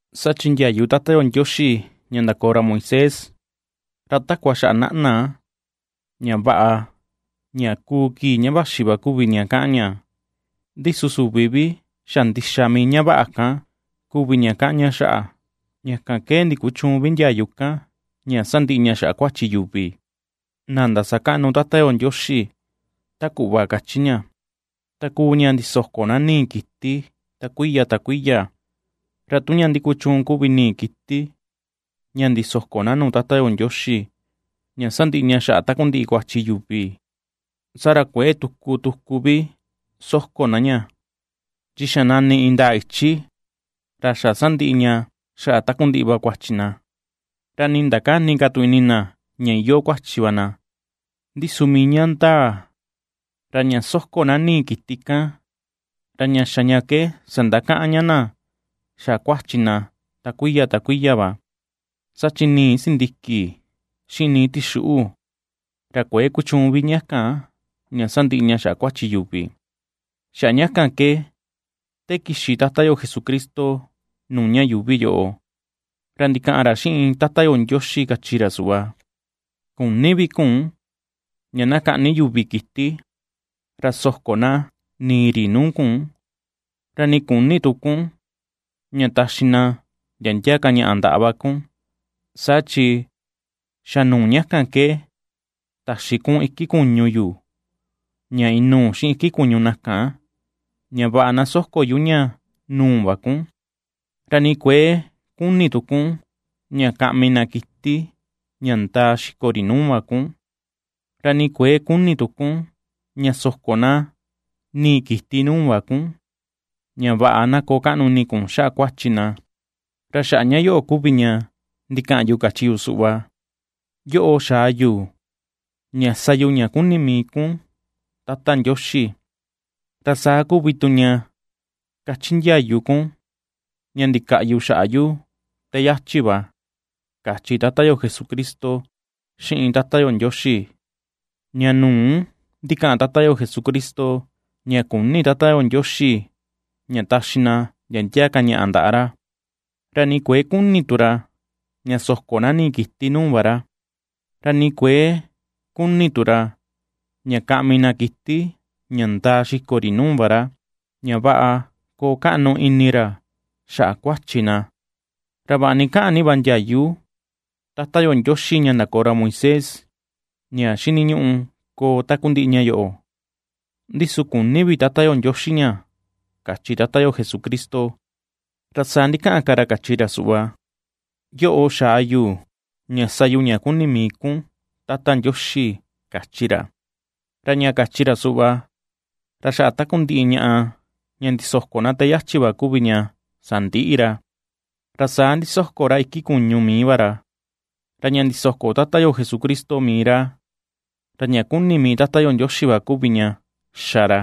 Saa chi ndiayu Tata yo Ndioxi ña ndakoo ra Moisés, ra takua xaꞌa naꞌna, ña vaꞌa, ña kuu kii ña vaxi va kuvi ña kaꞌan ña, ndi su süvi vi xa ndixa mii ña vaꞌa kan kuvi ña kaꞌan ña xaꞌa. Ña kan ke ndikuchüun vi ndiayu kan ña sandiꞌi ña xaꞌa kuachi yuvi na ndasakaꞌnu Tata yo Ndioxi ta kuꞌva kachi ña, ta kuu ña ndisoko na nii kiti ta kuiya ta kuiya. Ra tu ña ndikuchuun kuvi nii kiti ña ndisoko na nuu Tata yo Ndioxi, ña sandiꞌi ña xaꞌa takundiꞌi kuachi yuvi, saa ra kuëe tuku tuku vi soko na ña, chi xa nani indaa ichi ra xa sandiꞌi ña xaꞌa takundiꞌi va kuachi na, ra nii ndakäni ka tu ini na ña iyoo kuachi va na. Ndi su mii ña ndaa, ra ña ^soko na nii kita kan, ra ña xa ña ke sandakaꞌan ña na xaꞌa kuachi na ta kuiya ta kuiya va. Saa chi nii sindiki, xiꞌin nii tixuꞌu, ra kuëe kuchuun vi ña kan, ña sandiꞌi ña xaꞌa kuachi yuvi. Xaꞌa ña kan ke te kixi Tata yo Jesucristo nuu ña yuuvi yoꞌo, ra ndikaꞌan ra xiꞌin Tata yo Ndioxi kachi ra suꞌva: Küni vi kun ña na kaꞌni yuvi kiti, ra soko na nii ri nuu kun, ra ni küni tu kun ña taxi na ndia ndia ka ñaꞌa ndaꞌa va kun, saa chi xa nuu ña kan ke taxi kun iki kuñu yu ña inuu xiꞌin iki kuñu na kan, ña vaꞌa na soko yu ña nuu va kun. Ra ni kuëe kuni tu kun ña kaꞌmi na kiti ña ndaa xiko ri nuu va kun, ra ni kuëe kuni tu kun ña na soko na nii kiti nuu va kun, ña vaꞌa na koo kaꞌnu ini kun xaꞌa kuachi na. Ra xaꞌa ña yoꞌo kuvi ña ndikaꞌan yu kachi yu suꞌva: “Yoꞌo xaa yu ña sa yu ña kuni mii kun, Tata Ndioxi, ra saa kuvi tu ña ^kachi ndiayu kun ña ndikaꞌyu xaꞌa yu te yachi va”, kachi Tata yo Jesucristo xiꞌin Tata yo Ndioxi. Ña nu̱ú ndikaꞌan Tata yo Jesucristo, ña küni Tata yo Ndioxi ña taxi na ndia ndia ka ñaꞌa ndaꞌa ra, ra ni kuëe kuni tu ra ña soko na nii kiti nuu va ra, ra ni kuëe kuni tu ra ña kaꞌmi na kiti ña ndaa xiko ri nuu va ra, ña vaꞌa koo kaꞌnu ini ra xaꞌa kuachi na. Ra vaꞌa ni kaꞌan ni va ndiayu Tata yo Ndioxi ña ndakoo ra Moisés ña xiniñuꞌu koo takundiꞌi ña yoꞌo, ndi su küni vi Tata yo Ndioxi ña, kachi Tata yo Jesucristo. Ra saa ndikaꞌan ka ra kachi ra suꞌva: “Yoꞌo xaa yu ña sa yu ña kuni mii kun, Tata Ndioxi”, kachi ra. Ra ña kachi ra suꞌva, ra xaꞌa takundiꞌi ñaꞌa ña ndisoko na te yachi va kuvi ña sandiꞌi ra, ra saa ndisoko ra iki kuñu mii va ra. Ra ña ndisoko Tata yo Jesucristo mii ra, ra ña kuni mii Tata yo Ndioxi va kuvi ña xa ra.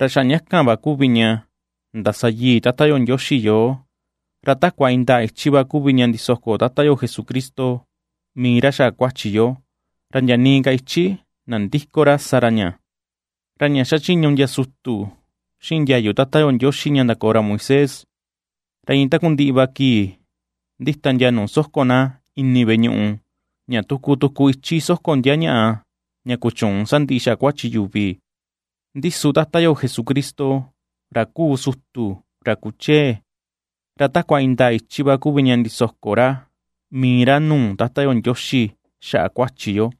Ra xaꞌa ña kan va kuvi ña ndasayii Tata yo Ndioxi yoo. Ra takua indaa ichi va kuvi ña ndisoko Tata yo Jesucristo mii ra xaꞌa kuachi yo, ra ndia nii ka ichi nandïko ra sa ra ña. Ra ña ^xachiñu ndia sutu xiꞌin ndiayu Tata yo Ndioxi ña ndakoo ra Moisés, ra iin takundiꞌi va kii ndita ndia nuu soko na ini veꞌe ñuꞌu, ña tuku tuku ichi soko ndia ñaꞌa ña kuchüun sandiꞌi xaꞌa kuachi yuvi. Ndi su Tata yo Jesucristo, ra kuu sutu ra kuchee, ra takua indaa ichi va kuvi ña ndisoko ra mii ra nuu Tata yo Ndioxi xaꞌa kuachi yo,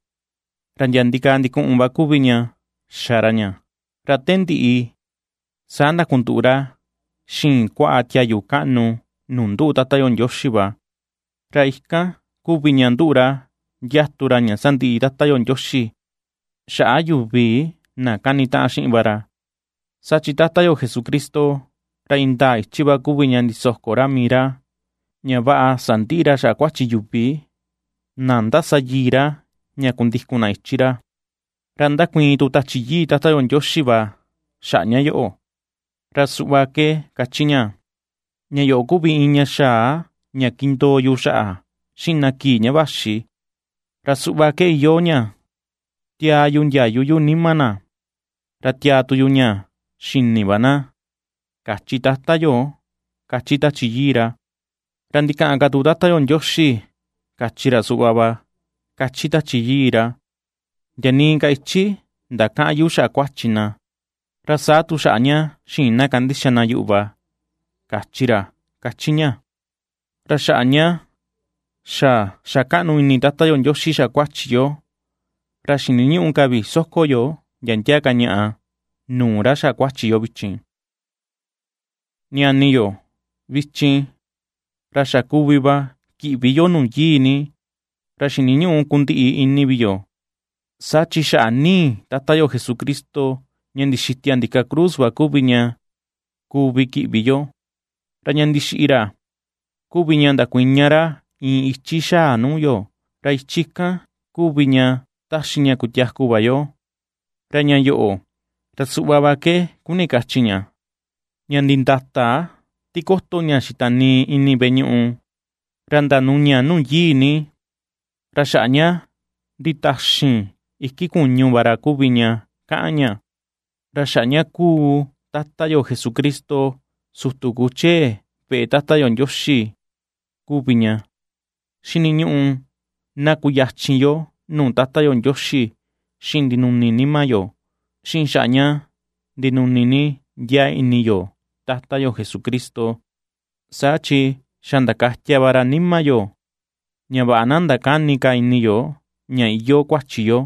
ra ndia ndikaa ndikuꞌun va kuvi ña xa ra ña. Ra te ndiꞌi saa ndakunduꞌu ra xiin kuaꞌa tiayu kaꞌnu nuu nduꞌu Tata yo Ndioxi va. Ra ikan kuvi ña nduꞌu ra ndiatu ra ña sandiꞌi Tata yo Ndioxi xaꞌa yuvi na kanitaꞌan xiꞌin va ra. Saa chi Tata yo Jesucristo, ra indaa ichi va kuvi ña ndisoko ra mii ra ña vaꞌa sandiꞌi ra xaꞌa kuachi yuvi na ^ndasayii ra ña kundikun na ichi ra. Ra ndakuiin tu Tachi Yii Tata yo Ndioxi va xaꞌa ña yoꞌo, Ra suꞌva ke kachi ña: Ña yoꞌo kuvi iin ña xaa ña kindoo yu xaꞌa xiꞌin na kii ña vaxi, ra suꞌva ke iyoo ña: Tiaa yu ndiayu yu nima na, ra tiaa tu yu ña xini va na, kachi Tata yo ^kachi Tachi Yii ra. Ra ndikaꞌan ka tu Tata yo Ndioxi kachi ra suꞌva va kachi Tachi Yii ra: Ndia nii ka ichi ndakäꞌan yu xaꞌa kuachi na, ra saa tu xaꞌa ña xïin na kandixa na yuꞌu va, kachi ra ^kachi ña. Ra xaꞌa ña xa xa kaꞌnu ini Tata yo Ndioxi xaꞌa kuachi yo, ra xiniñüꞌu ka vi soko yo ndia ndia ka ñaꞌa nuu ra xaꞌa kuachi yo vichin. Ñani yo, vichin, ra xa kuvi va kiꞌvi yo Nuu Yii Ni, ra xiniñüꞌu kundiꞌi ini vi yo, saa chi xaꞌa nii Tata yo Jesucristo ña ndixitia ndika cruz va kuvi ña kuvi kiꞌvi yo. Ra ña ndixiꞌi ra kuvi ña ndakuiña ra iin ichi xa̱a nuu yo; ra ichi kan kuvi ña ^taxi ña kutiaku va yo, ra ña yoꞌo, ra suꞌva va ke kuni kachi ña, ña nditata tikoto ña xitanii ini veꞌe ñuꞌu, ra ndanuña Nuu Yii Ni, ra xaꞌa ña nditaxin iki kuñu va ra kuvi ña kaꞌan ña. Ra xaꞌa ña xa ^kuu Tata yo Jesucristo, sutu kuchee veꞌe Tata yo Ndioxi kuvi ña, xiniñuꞌu na kuyachin yo nuu Tata yo Ndioxi xiꞌin ndinuni nima yo, xiꞌin xaꞌa ña ndinuni ni ndiaa ini yo Tata yo Jesucristo; saa chi xa ndakatia va ra nima yo, ña vaꞌa na ndakäni ka ini yo ña iyoo kuachi yo,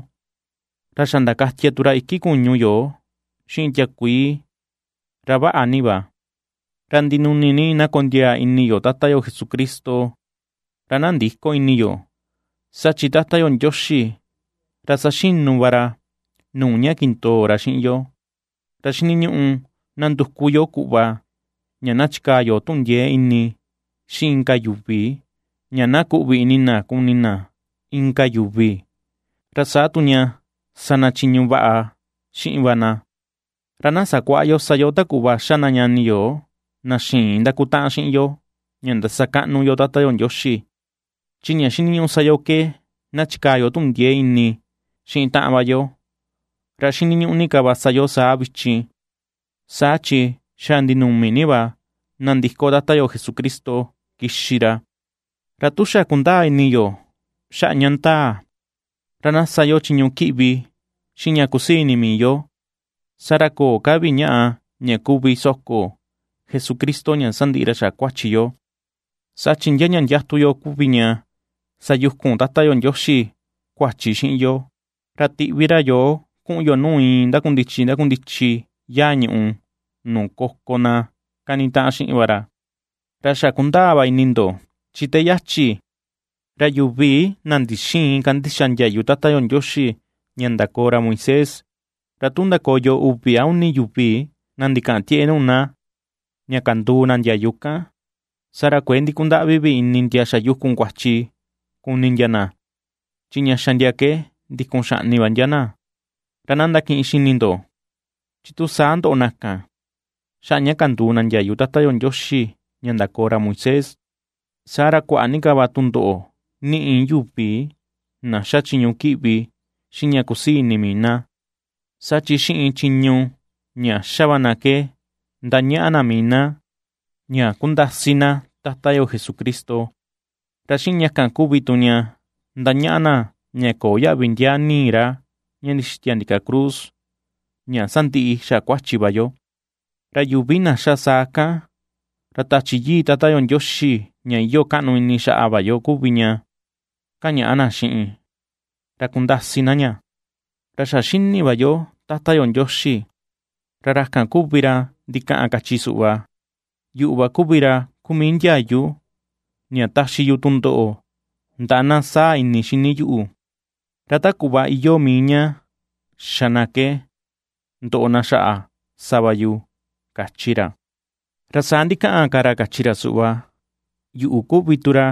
ra xa ndakatia tu ra iki kuñu yo xiꞌin tiakuii, ra vaꞌa ni va. Ra ndinuni ni na kondiaa ini yo Tata yo Jesucristo, ra na ndïko ini yo, saa chi Tata Ndioxi, ra saxinu va ra nuu ña kindoo ra xiꞌin yo. Ra xiniñuꞌu na nduku yo kuꞌva ña na chikaa yo tuꞌun ndiee ini xiꞌin inka yuvi ña na kuꞌvi ini na kuni na inka yuvi, ra saa tu ña sa na chiñu ña vaꞌa xiꞌin va na. Ra na sakuäꞌa yo sa yo ta kuꞌva ^xa na ñani yo na xïin ndakutaꞌan xiꞌin yo ña ndasakaꞌnu yo Tata yo Ndioxi, chi ña xiniñuꞌu sa yo ke na chikaa yo tuꞌun ndiee ini xiꞌin taꞌan va yo, ra xiniñuꞌu ni ka va sa yo saa vichin, saa chi xa ndinumi ni va nandiko Tata yo Jesucristo kixi ra. Ra tu xa kundaa ini yo xaꞌa ña ndaa, ra na sa yo chiñu kiꞌvi xiꞌin ña kusii ini mii yo, saa ra köo ka vi ñaꞌa ña kuvi soko Jesucristo ña sandiꞌi ña xaꞌa kuachi yo. Saa chi ndia ña ndiatu yo kuvi ña sayukun Tata yo Ndioxi kuachi xiꞌin yo, ra tiꞌvi ra yoo kuꞌun yo nuu iin ndakundichi ndakundichi yaa ñuꞌu nuu koko na kanitaꞌan xiꞌin va ra. Ra xa kundaa va ini ndo, chi te yachi, ra yuvi na ndixïin kandixa ndiayu Tata yo Ndioxi ña ndakoo ra Moisés, ra tu ndakoyo uvi a uni yuvi na ndikaꞌan tieꞌe nuu na, ña kanduu na ndiayu kan, saa ra kuëe ndikundaꞌvi vi ini ndia xayukun kuachi kuni ndia na, chi ña xa ndia ke ndikun xaꞌni va ndia na. Ra na ndakiꞌin xini ndo chi tu sa ndoꞌo na kan, xaꞌa ña kanduu na ndiayu Tata yo Ndioxi ña ndakoo ra Moisés, saa ra kuaꞌa ni ka va tundoꞌo niꞌi yuvi na ^xa chiñu kiꞌvi xiꞌin ña kusii ini mii na, saa chi xiꞌin chiñu ña ^xa va na ke ^ndañaꞌa na mii na ña ^kundasi na Tata yo Jesucristo, ra xiꞌin ña kan kuvi tu ña ^ndañaꞌa na ña köo yaꞌvi ndiaa nii ra ña ndixitia ndika cruz ña sandiꞌi xaꞌa kuachi va yo; ra yuvi na xa saa kan, ra Tachi Yii Tata yo Ndioxi ña iyoo kaꞌnu ini xaꞌa va yo kuvi ña ^kañaꞌa na xiꞌin, ra ^kundasi na ña. Ra xa xini va yo Tata yo Ndioxi, ra ra kan kuvi ra ndikaꞌan kachi suꞌva: “Yuꞌu va kuvi ra kuu mii ndiayu ña taxi yu tundoꞌo ndaꞌa na saa ini xini yuꞌu; ra ta kuꞌva iyoo mii ña xa na ke ndoꞌo na xaꞌa sa va yu”, kachi ra. Ra saa ndikaꞌan ra ka ra kachi ra suꞌva: “Yuꞌu kuvi tu ra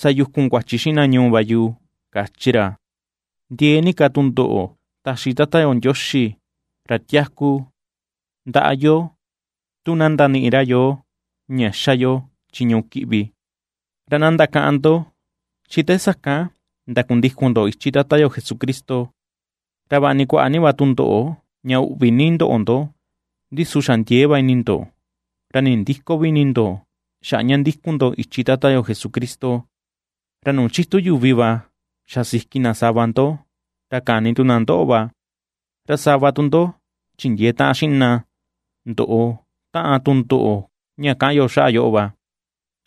sayukun kuachi xiꞌin na ñuu va yu”, kachi ra. Ndiee ni kaa tundoꞌo taxi Tata yo Ndioxi, ra tiaku, ndaꞌa yo tu na ndaniꞌi ra yoo ña ^xa yo chiñu kiꞌvi. Ra na ndakaꞌan ndo chi te sakan ndakundikun ndo ichi Tata yo Jesucristo. Ra vaꞌa ni kuaꞌa ni va tundoꞌo ña uꞌvi ni ndoꞌo ndo, ndi su xa ndiee va ini ndo, ra nindïko vi ini ndo xaꞌa ña ndikun ndo ichi Tata yo Jesucristo. Ra nuu chitu yuvi va xa siki na sava ndo, ra kani tu na ndoꞌo va, ra sava tu ndo chindiee taꞌan xiꞌin na ndoꞌo taꞌan tundoꞌo ña kaꞌan yo xaꞌa yoꞌo va.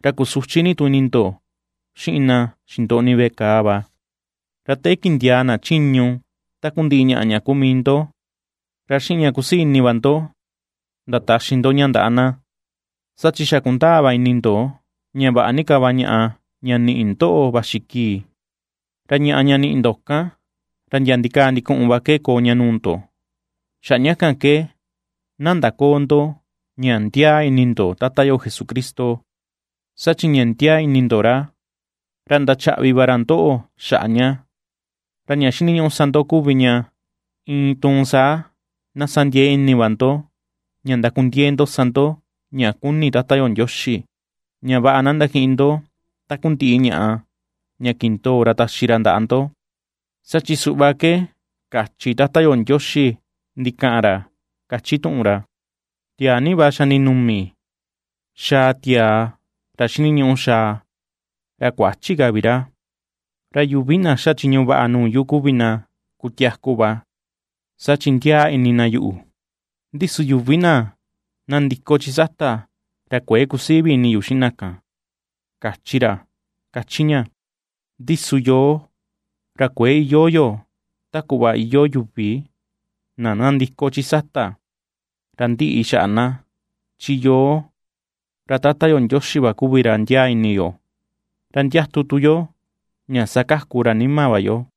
Ra kusuchi ni tu ini ndo xiꞌin na xindoꞌni veꞌe kàà va. Ra te kindiaa na chiñu takundiꞌi ñaꞌa ña kuu mii ndo, ra xiꞌin ña kusii ini va ndo ndataxi ndo ña ndaꞌa na. Saa chi xa kundaa va ini ndo ña vaꞌa ni ka va ñaꞌa ña niꞌi ndoꞌo vaxi kii, ra ñaꞌa ña niꞌi ndo kan, ra ndia ndikaa ndikuꞌun va ke koo ña nuu ndo. Xaꞌa ña kan ke na ndaköo ndo ña ndiaa ini ndo Tata yo Jesucristo, saa chi ña ndiaa ini ndo ra, ra ndachaꞌvi va ra ndoꞌo xaꞌa ña. Ra ña xiniñuꞌu sa ndo kuvi ña, iin tuun saa na sa ndiee ini va ndo ña ndakundiee ndo sa ndo ña kuni Tata yo Ndioxi, ña vaꞌa na ndakiꞌin ndo takundiꞌi ñaꞌa ña kindoo ra taxi ra ndaꞌa ndo. Saa chi suꞌva ke kachi Tata yo Ndioxi ndikaꞌan ra ^kachi tuꞌun ra: Tiaa ni va xa ndinumi xaa tiaa ra xiniñuꞌu xaa, ra kuächi ka vi ra. Ra yuvi na xa chiñu vaꞌa nuu yu kuvi na kutiaku va, saa chi ndiaa ini na yuꞌu, ndi su yuvi na nandiko chi sata, ra kuëe kusii vi ini yu xiꞌin na kan, kachi ra ^kachi ña. Ndi su yoo, ra kuëe iyoo yo ta kuꞌva iyoo yuvi na nandiko chi sata, ra ndiꞌi xaꞌa na, chi yoo, ra Tata yo Ndioxi va kuvi ra ndiaa ini yo, ra ndiatu tu yo ña sakaku ra nima va yo.